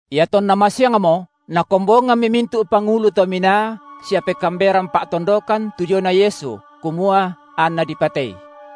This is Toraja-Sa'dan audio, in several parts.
Iatonna masiangmo, nakombongammi mintu’ pangulu to minaa sia pekaamberan pa’tondokan tu diona Yesu, kumua anNa dipatei.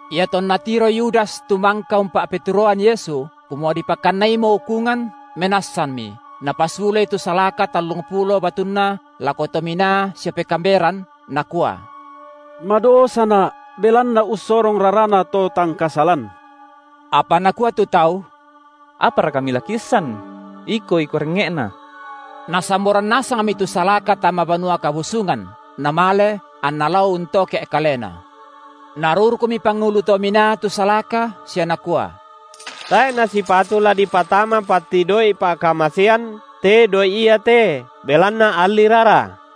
Iatonna tiroi Yudas tu mangka umpa’peturoan Yesu, kumua dipakannaimo ukungan, menassanmi, napasulei tu salaka tallungpulo batunna lako to minaa sia pekaamberan, nakua: Madosana’, belanna ussorong rarana to tang kasalan. Apa nakua tu tau: Apara kami la kiissan? Iko iko rengnge’na. Nasamboran nasangmi tu salaka tama Banua Kabusungan, namale, anna lao untoke’ kalena. Narurukmi pangulu to minaa tu salaka sia nakua: tae’ nasipatu la dipatama patti doi’ pa’kamasean te doi’ iate, belanna alli rara.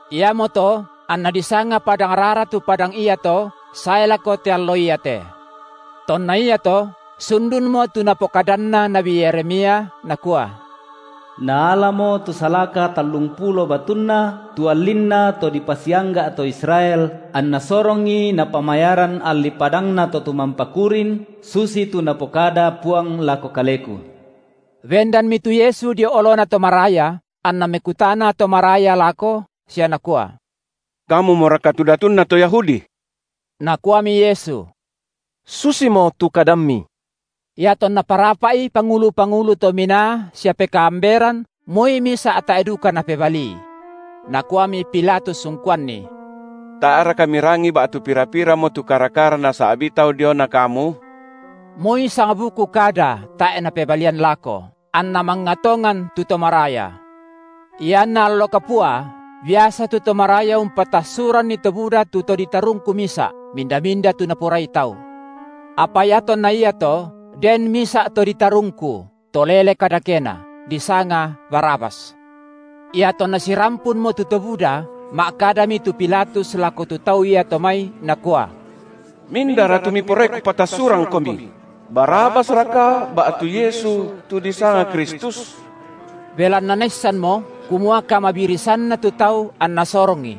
Iamoto anna disanga Padangrara tu padang iato sae lako te allo iate. Tonna iato sundunmo tu napokadanna nabi Yeremia, nakua: Naalamo tu salaka tallungpulo batunna, tu allinna to dipasiangga’ to Israel, anna sorongi napamayaran alli padangna to tumampa kurin, susitu Napokada Puang lako kaleku. Bendanmi tu Yesu dio olona to maraya, anna mekutana to maraya lako, sia nakua: Kamumoraka tu Datunna to Yahudi? Nakuami Yesu: Susimo tu kadammi. Iatonna parapa’i pangulu-pangulu to minaa sia pekaamberan moi misa’ tae’ duka Napebalii. Nakuami Pilatus ungkuanNi: Tae’raka Mirangii ba’tu pira-piramo tu kara-kara nasa’bii tau diona Kamu? Moi sangbuku kada tae’ Napebalian lako, anna mangnga tongan tu to maraya. Ianna allo kapua biasa tu to maraya umpatassuranni to buda tu to ditarungku misa’, minda-minda tu naporai tau. Apa iatonna iato, den misa’ to ditarungku, to lele kadakena, disanga Barabas. Iatonna sirampunmo tu to buda, ma’kadami tu Pilatus lako tu tau iato mai nakua: Mindara tu miporai kupatassurangkomi? Barabas raka ba’tu Yesu, tu disanga Kristus? Belanna naissanmo, kumua kamabirisanna tu tau anna sorongI.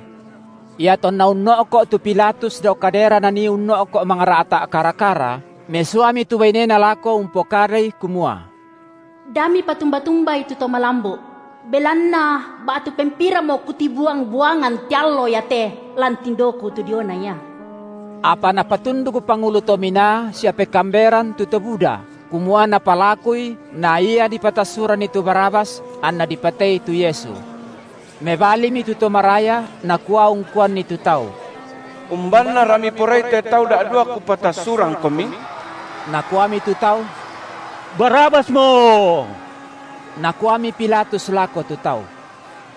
Iatonna unno’ko’ tu Pilatus dao kadera nanii unno’ko’ mangra’ta’ kara-kara, mesuami tu bainena lako umpokadai kumua: Da mipatumba-tumbai tu to malambu’; belanna ba’tu pempiranmo kutibuang-buangan te allo iate lan tindoku tu diona Ia. Apa napatunduk pangulu to minaa sia pekaamberan tu to buda, kumua napalakui naia dipatassuranni tu Barabas, anna dipatei tu Yesu. Mebalimi tu to maraya nakua ungkuanni tu tau: Umbannara miporai te tau da’dua kupatassurangkomi? Nakuami tu tau: Barabasmo. Nakuami Pilatus lako tu tau: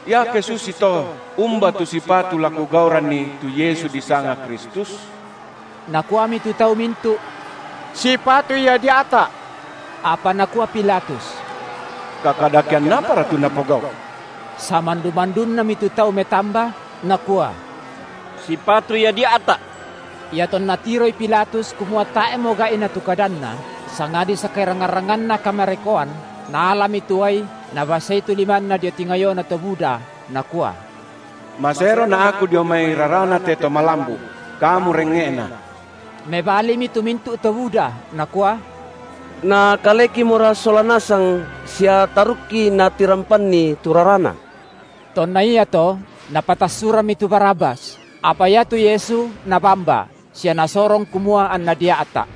Iake susito, umba tu sipatu la kugauranNi tu Yesu disanga Kristus? Nakuami tu tau mintu’: Sipatu Ia dia’ta’. Apa nakua Pilatus: Kakadakean apara tu napogau’? Samandu-mandunnami tu tau metamba, nakua: Sipatu Ia dia’ta’! Iatonna tiroi Pilatus kumua tae’mo gai’na tu kadanna, sangadi sakerangngan-rangnganna kamarekoan, naalami tu uai nabasei tu limanna dio tingayona to buda, nakua: Maserona’ aku dio mai raraNa te to malambu’: kamu rengnge’na! Mebalimi tu mintu’ to buda, nakua: Na kalekimora sola nasang sia tarukki natirampanni tu raraNa. Tonna iato napatassurammi tu Barabas, apa iatu Yesu nabamba, sia nasorong kumua anNa dia’ta’.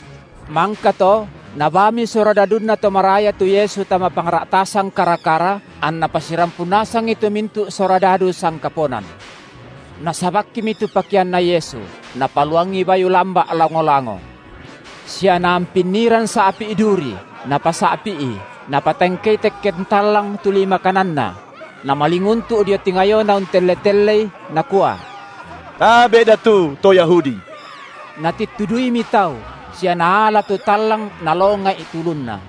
Mangkato nabaami surodadunna to maraya tu Yesu tama pangra’tasan kara-kara, anna pasirampun nasangi tu mintu’ surodadu sangkaponan. Nasabakkimi tu pakeanna Yesu, napaluangi bayu lamba’ lango-lango. Sia naampinniran sa’pi’ duri, napasa’pi’i, napatangkei tekken tallang tu lima kananNa; namalinguntu’ dio tingayoNa untelle-telleI, nakua: Tabe’ datu to Yahudi! Natittuduimi tau, sia naala tu tallang nalonga’i tu ulunNa.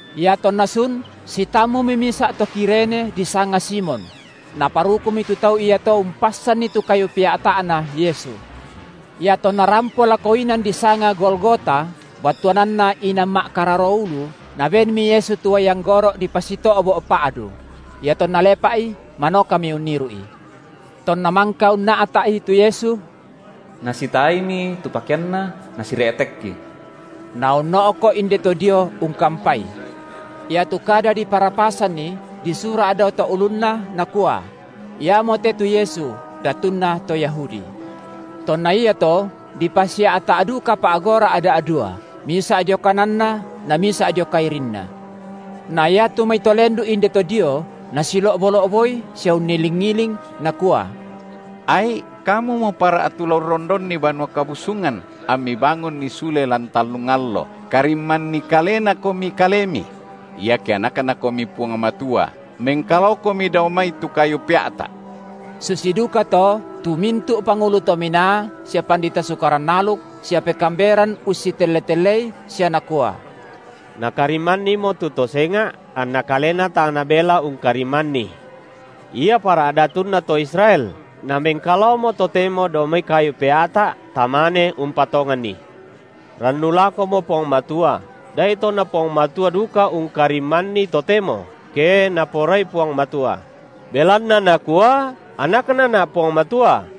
Iatonna sun, sitammumi misa’ to Kirene disanga Simon; naparukumi tu tau iato umpassanni tu kayu pea’ta’Na Yesu. Iatonna rampo lako inan disanga Golgota, battuananna Inan ma’kararo ulu, nabenmi Yesu tu uai anggoro’ dipasito’bo’ pa’du; iatonna lepa’i, manokami unniru’i. Tonna mangka unna’ta’i tu Yesu, nasitaaimi tu pakeanNa nasire’tekki. Naunno’ko’ indeto dio ungkampai. Iatu kada diparapasanni disura’ dao to’ ulunNa nakua: Iamote tu Yesu, Datunna to Yahudi. Tonna iato dipasia’ta’ duka pa’gora’ da’dua, misa’ dio kananNa, na misa’ dio kairinNa. Na iatu mai to lendu’ indeto dio nasilo’bo-lo’boi sia unniling-iling, Nakua: ai’, Kamumo para’ tu la urrondonni Banua Kabusungan amMi bangunni sule lan tallung allo, karimmanni kalenamoKomi Kalemi; iake AnakNaKomi Puang Matua, mengkalaoKomi dao mai tu kayu pea’ta’! Susi duka tu to mintu’ pangulu to minaa sia pandita Sukaran aluk sia pekaamberan ussitelle-tellei, sia nakua: Nakarimmannimo tu to senga’, anna Kalena tang nabela ungkarimmanni. Ia para’ Datunna to Israel, namengkalaomo totemo dao mai kayu pea’ta, tamane umpatonganNi. Rannu lakomo Puang Matua, da’ito na Puang Matua duka ungkarimmanNi totemo, ke Naporai Puang Matua; belanna nakua: AnaknaNa’ Puang Matua.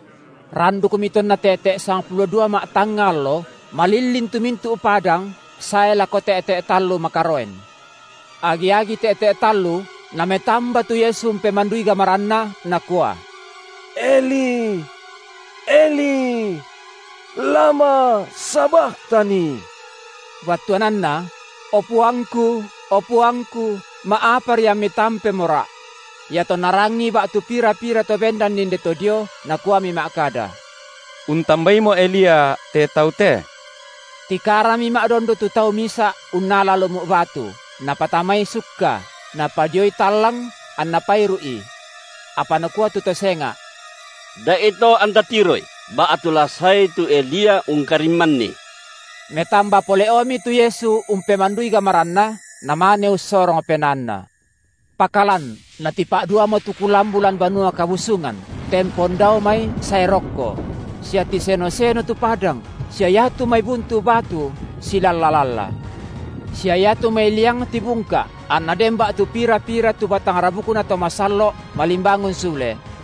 Randukmi tonna te’te’ sangpulo dua ma’tangnga allo malillin tu mintu’ padang sae lako te’te’ tallu makaroen. Agi-agi te’te’ tallu Nametamba tu Yesu umpemandui gamaranNa, Nakua: Eli, Eli lama sabakhtani! battuananna: O PuangKu, o PuangKu, ma’apari amMi tampemoRa’. Iatonna rangii ba’tu pira-pira to bendan inde to dio, nakuami ma’kada: untambaimo Elia te Tau te. Tikarami ma’dondo tu tau misa’ unnala lumu’ batu, napatamai sukka, napadioi tallang, anna pairu’I. Apa nakua tu to senga’: Da’ito, anta tiroi: ba’tu la saei tu Elia ungkarim- manni! Metamba pole’omi tu Yesu umpemandui gamaranNa, namane ussorong PenaanNa. Pakalan natipa’duamo tu kulambu lan Banua Kabusungan, tempon dao mai sae rokko; sia tiseno-seno tu padang; sia iatu mai buntu batu silalla-lalla. Sia iatu mai liang tibungka’, anna den ba’tu pira-pira tu batang rabukna to masallo’ malimbangun sule;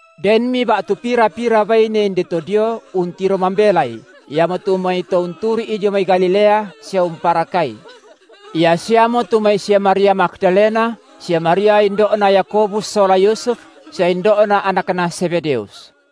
Denmi ba’tu pira-pira baine inde to dio untiro mambelai, iamotu mai to unturru’I dio mai Galilea sia umparakai. Ia siamo tu mai sia Maria Magdalena sia Maria indo’na Yakobus sola Yusuf, sia indo’na anakna Zebedeus.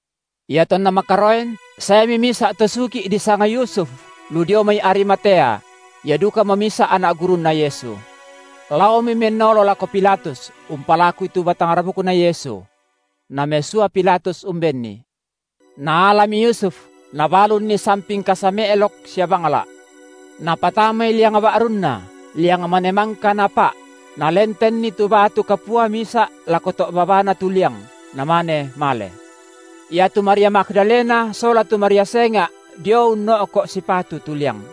Iatonna makaroen, saemi misa’ to sugi’ disanga Yusuf, lu dio mai Arimatea; ia dukamo misa’ anak gurunNa Yesu. Laomi mennolo lako Pilatus umpalakui tu batang rabukNa Yesu. Namesua Pilatus umbenni. Naalami Yusuf, nabalunni sampin kasa me’lok sia bangla’. Napatamai liang ba’runna, liang mane mangka napa’; nalentenni tu batu kapua misa’ lako to’ babana tu liang, namane male. Iatu Maria Magdalena sola tu Maria senga’ dio unno’ko’ sipatu tu liang.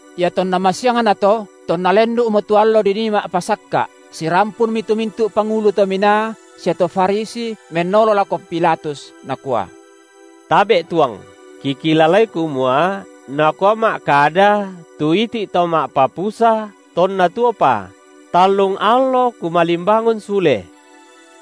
Iatonna masiangnato, tonna lendu’mo tu allo dinii ma’pasakka’, sirampunmi tu mintu’ pangulu to minaa sia to Farisi mennolo lako Pilatus, nakua: Tabe’ tuang, kikilalai kumua nakua ma’kada tu iti’ To ma’papusa tonna tuopa: tallung allo Kumalimbangun sule.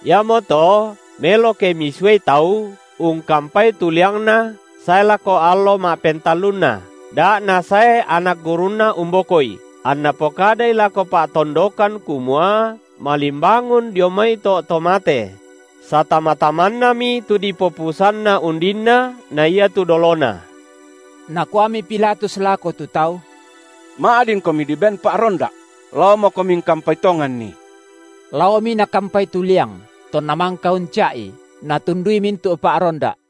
Iamoto melo ke misuai tau ungkampai tu liangNa sae lako allo ma’pentallunna, da’ nasae anak gurunNa umbokoI, anna pokadai lako pa’tondokan kumua malimbangun dio mai to’ to mate; satama-tamannami tu dipopusanna undinna na iatu dolona. Nakuami Pilatus lako tu tau: Ma’dinkomi diben pa’ronda’; laomokomi ungkampai tonganni. Laomi nakampai tu liang, tonna mangka unca’i, natundui mintu’ pa’ronda’.